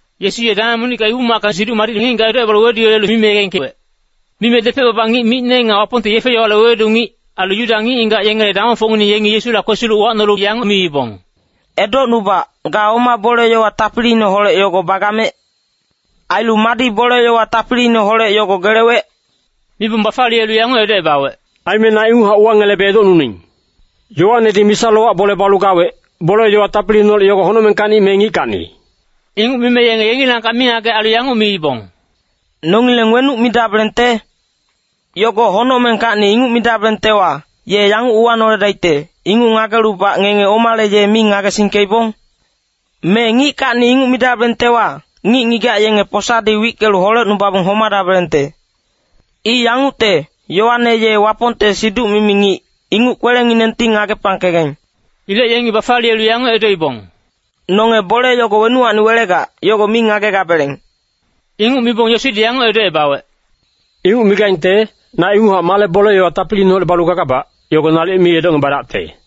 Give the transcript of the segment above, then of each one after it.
Yesu ye dameng monicka Ibu-macka Siduc Madicne ngic-ngigac edocebalu weduyelelu mime yegengkewec. Mime depec-baba ngic micne nga Wapongte yefe-yowale wewedu ngic, ailu Yuda ngic-ngigac yengele damongfocngineng yengi Yesula kwesilu uwacnolu yanguc miibong, “Edocnubac, ga oma bole-yowa tapiliineholec yogo bagamec? Ailu madi bole-yowa tapiliineholec yogo gelewec?” Mibong bafaliyelu yanguc edocebawec, “Aime na inguchac uwangelebe edocnuning. Yoanedi misa-lowac bole balu gawec, bole-yowa tapiliineholec yogo honocmengkacni me ngickacni?” Inguc mime yenge yengilangkac mingagec ailu yanguc miibong, “Nongileng wenuc midabelengte? ‘Yogo honocmengkacni’ inguc midabelengtewa, ye yanguc uwanoledaicte, ‘Inguc ngagelubac ngenge omale ye mi ngagesingkeibong?’ Me ‘ngickacni’ inguc midabelengtewa, ngic-ngigac yenge posadi wickelu holecnubabong homadabelengte. I yangucte, Yoane ye Wapongte siduc-mimi ngic, inguc kwelenginengti ngagepangkegaing.” Ilec yengi bafaliyelu yanguc edoibong, “Nonge bole yogo wenuwacni welegac, yogo mi ngagegabeleng.” Inguc mibong Yesudi yanguc edocebawec, “Inguc migaingte, na inguchac male bole-yowa tapiliineholec balu gagabac, yogo nalic mi edocngebadacte.”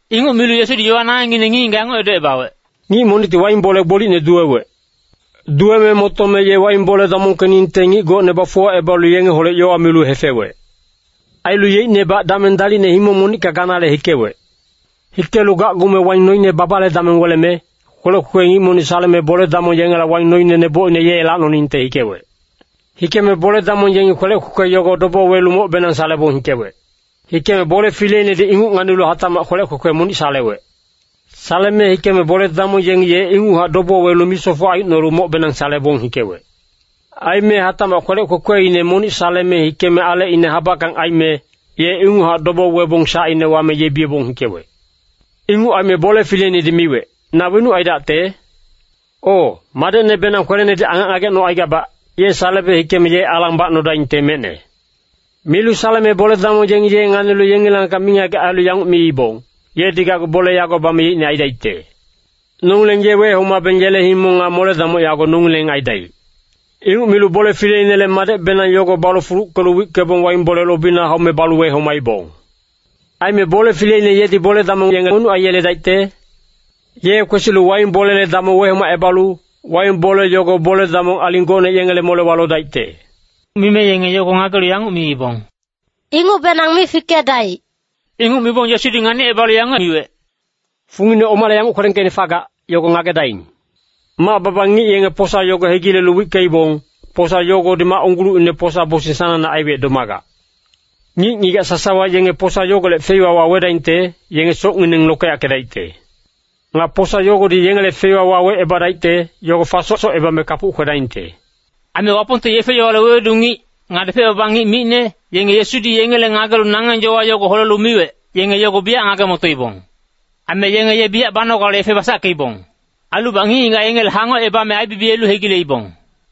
Inguc milu Yesudi yowa nangengngine ngic-ngigac yanguc edocebawec, “Ngic monicti waing bole gbolicne duwewec. Duweme motome ye waing bole damongkeningte ngic gocne bafuwacebalu yengeholec yowa milu hefewec. Ailu yeicnebac dameng dalicne himong monicka ganale hikewec. “Hikelu gacgume waing noine babale dameng weleme, kwelec kwekwe ngic monic saleme bole-damong yengela waing noine nebocine ye lacnoningte hikewec. Hikeme bole-damong yengi kwelec kwekwe yogo dobo welu mocbenang salebong hikewec. Hikeme bole fileinedi inguc nganilu hatacmac kwelec kwekwe monic salewec. Saleme hikeme bole-damong yengi ye inguchac dobo welu misofoc aicnolu mocbenang salebong hikewec. Aime hatacmac kwelec kwekweine monic saleme hikeme alecine habackang aime, ye inguchac dobo webong sacine wame yebiyebong hikewec. “Inguc aime bole fileinedi miwec, ‘Na wenuc aidacte? O, madecnebenang kwelenedi angac ngagecnocaigabac, ye salebe hikeme ye alang bacnodaingte mecne.’ “Milu saleme bole-damong yengi ye nganilu yengilangkac mingagec ailu yanguc miibong, ‘Yedi gacgu bole yago bame yeicne aidaicte. Nongileng ye wehomabeng yele himong nga mole-damoc yago nongileng aidaic.’ Inguc milu bole fileinele madecbenang yogo balu fuluckelu wickebong waing bole lobina haume balu wehomaibong.” “Aime bole fileine yedi bole-damong yenge wenuc aiyeledaicte? Ye kwesilu waing bolele damong wehomacebalu, waing bole yogo bole-damong aling gocne yengele molewa lodaicte.” Mime yenge yogo ngagelu yanguc miibong, “Ingucbenang mi fikedaic.” Inguc mibong Yesudi nganicebalu yanguc miwec, “Fungine omale yanguc kwelengkeicne fagac, yogo ngagedaing. ‘Mac-baba ngic yenge posa yogo hegilelu wickeibong, posa yogodi mac unggulucinele posa-bosing sanangne aiwec domagac.’ Ngic-ngigac sasawa yenge posa yogolec feiwa wawedaingte, yenge socngineng lokeyackedaicte. Nga posa yogodi yengele feiwa wawecebadaicte, yogo fasosocebame kapuc kwedaingte.” Aime Wapongte yefe-yowale wewedu ngic, nga depec-baba ngic micne, yenge Yesudi yengele ngagelu nangeng yowa yogo holelu miwec, yenge yogo biyac ngage-motoibong. Aime yenge ye biyac banogale yefe basackeibong. Ailubac ngic-ngigac yengele hangocebame aibibiyelu hegileibong.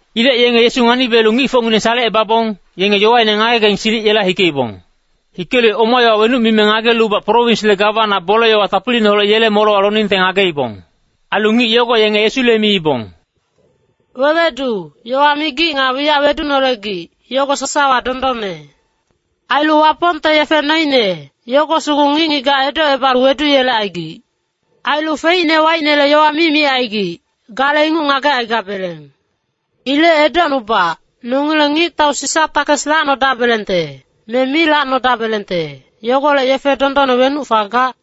Ilec yenge Yesu nganibiyelu ngicfocngineng salecebabong, yenge yowaine ngagegaing silic yela hikeibong. Hikelu oma yowa wenuc mime ngagelubac prowinsle gawana bole-yowa tapiliineholec yele molewa loningte ngageibong. Ailu ngic yogo yenge Yesule miibong, “Wewedu, yowa migic nga wiyac wedunolegic, yogo sasawa dondonne. Ailu Wapongte yefe noine, yogo sugu ngic-ngigac edocebalu weduyelecaigic. Ailu feicne waicnele yowa mi micaigic, gale inguc ngagecaigabeleng. Ilec edocnubac, nongileng ngictau Sisa takes lacnodabelengte, me mi lacnodabelengte, yogolec yefe dondonne wenuc fagac?”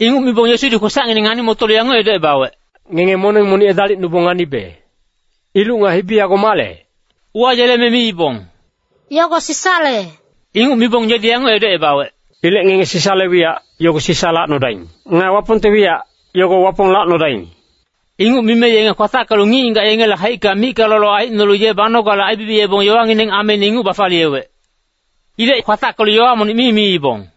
Inguc mibong Yesudi kwesacngineng ngani-motolu yanguc edocebawec, “Ngenge moneng monic edalicnubong nganibe! Iluc nga hibi yago male?” Uwayeleme miibong, “Yogo Sisale.” Inguc mibong yedi yanguc edocebawec, “Ilec ngenge Sisale wiyac, yogo Sisa lacnodaing. Nga Wapongte wiyac, yogo Wapong lacnodaing!” Inguc mime yenge kwatackelu ngic-ngigac yengele haicka micka lolo aicnolu ye banogale aibibiyebong yowangineng ameine inguc bafaliyewec. Ilec kwatackelu yowa monic mi miibong.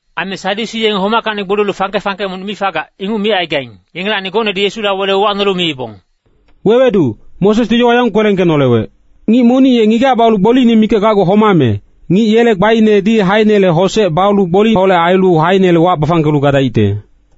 Aime Sadyusi yenge homackacni gboliyelu fangke-fangke monic mi fagac, inguc micaigaing, yengelacni gocnedi Yesula wele uwacnolu miibong, “Wewedu, Mosesdi yowa yanguc kwelengkenolewec. ‘Ngic monic ye ngigac balu gboliine mikac gacgu homame, ngic yele gbainedi haeinele hosec balu gboliholec ailu haeinele wac bafangkelu gadaicte.’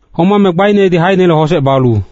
Homame gbainedi haeinele hosec balu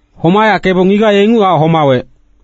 Homayackebong ngigac ye inguchac homawec.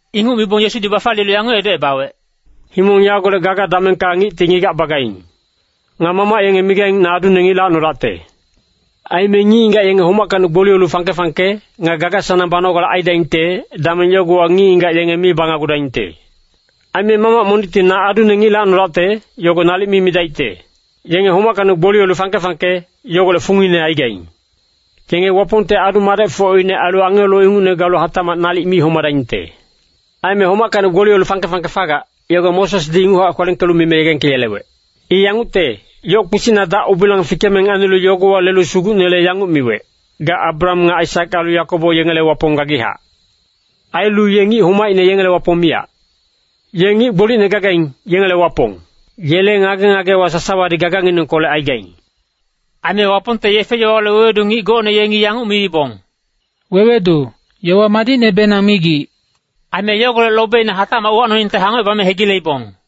Inguc mibong Yesudi bafaliyelu yanguc edocebawec, “Himong yagolec gaga damengka ngicti ngigac bagaing. Nga mamac yenge migaing ‘Na adune ngic lacnodacte.’ Aime ngic-ngigac yenge homackacni gboliyelu fangke-fangke, nga gaga-sanang banogale aidaingte, dameng yogowa ngic-ngigac yenge mi banagudaingte. Aime mamac monicti ‘Na adune ngic lacnodacte,’ yogo nalic mi midaicte. Yenge homackacni gboliyelu fangke-fangke, yogolec fungine aigaing. Yenge Wapongte adu-madecfocine ailu angelo ingucne galu hatacmac nalic mi homadaingte. Aime homackacni gboliyelu fangke-fangke fagac, yogo Mosesdi inguchac kwelengkelu mime yegengkeyelewec. I yangucte, yoc kpisicna dac-ubilang fikeme nganilu yogowa lelu Sugucnele yanguc miwec, ‘Ga Abraham nga Aisak ailu Yakobo yengele Wapong gagichac.’ Ailu ye ngic homaicne yengele Wapong miyac. Ye ngic gbolicne gagaing, yengele Wapong. Yele ngage-ngagewa sasawadi gaganginengkolec aigaing.” Aime Wapongte yefe-yowale wewedu ngic gocne yengi yanguc miibong, “Wewedu, yowa madicnebenang migic.” Aime yogolec lobeina hatacmac uwacnoningte hangocebame hegileibong.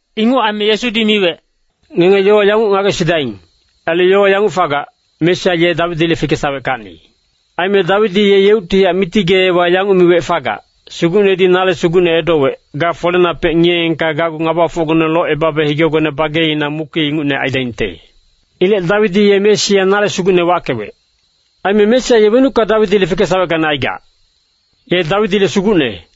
Inguc aime Yesudi miwec, “Ngenge yowa yanguc ngagesidaing, ailu yowa yanguc fagac, ‘Mesia ye Dawidile fikesaweckacni.’ Aime Dawidi ye yeuctihac Miti geewa yanguc miwec fagac, ‘Sugucnedi nale Sugucne edowec, “Ga folenapec ngiyeengka gacgu ngabafocgone locebabe higegone bageina muki ingucne aidaingte.” ’ Ilec Dawidi ye Mesia ‘Nale Sugucne’ wackewec. Aime Mesia ye wenucka Dawidile fikesaweckacni aigac? Ye Dawidile Sugucne.”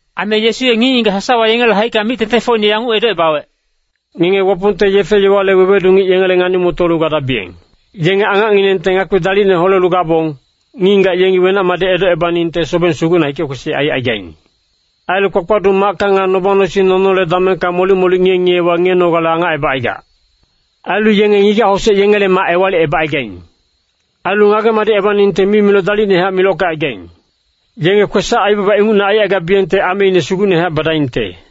Aime Yesu ye ngic-ngigac sasawa yengele haicka mic-tengtengfocine yanguc edocebawec, “Ngenge Wapongte yefe-yowale wewedu ngic yengele ngani-motolu gadabiyeng. Yenge angacnginengte ngakpi dalicne holelu gabong, ngic-ngigac yengi wenac-madic edocebaningte sobeng sugucna hike-kwesic aicaigaing. Ailu kpakpaduc macka nga noba-nosing nonole damengka molic-molic ngiye-ngiyewa ngiyenogale angacebacaigac. Ailu yenge ngigac-hosec yengele mac ewalicebacaigaing. Ailu ngage-madicebaningte mimiloc dalicnehac milockecaigaing. Yenge kwesac-aibaba ingucne aicaigabiyengte ameine sugucnehac badaingte.”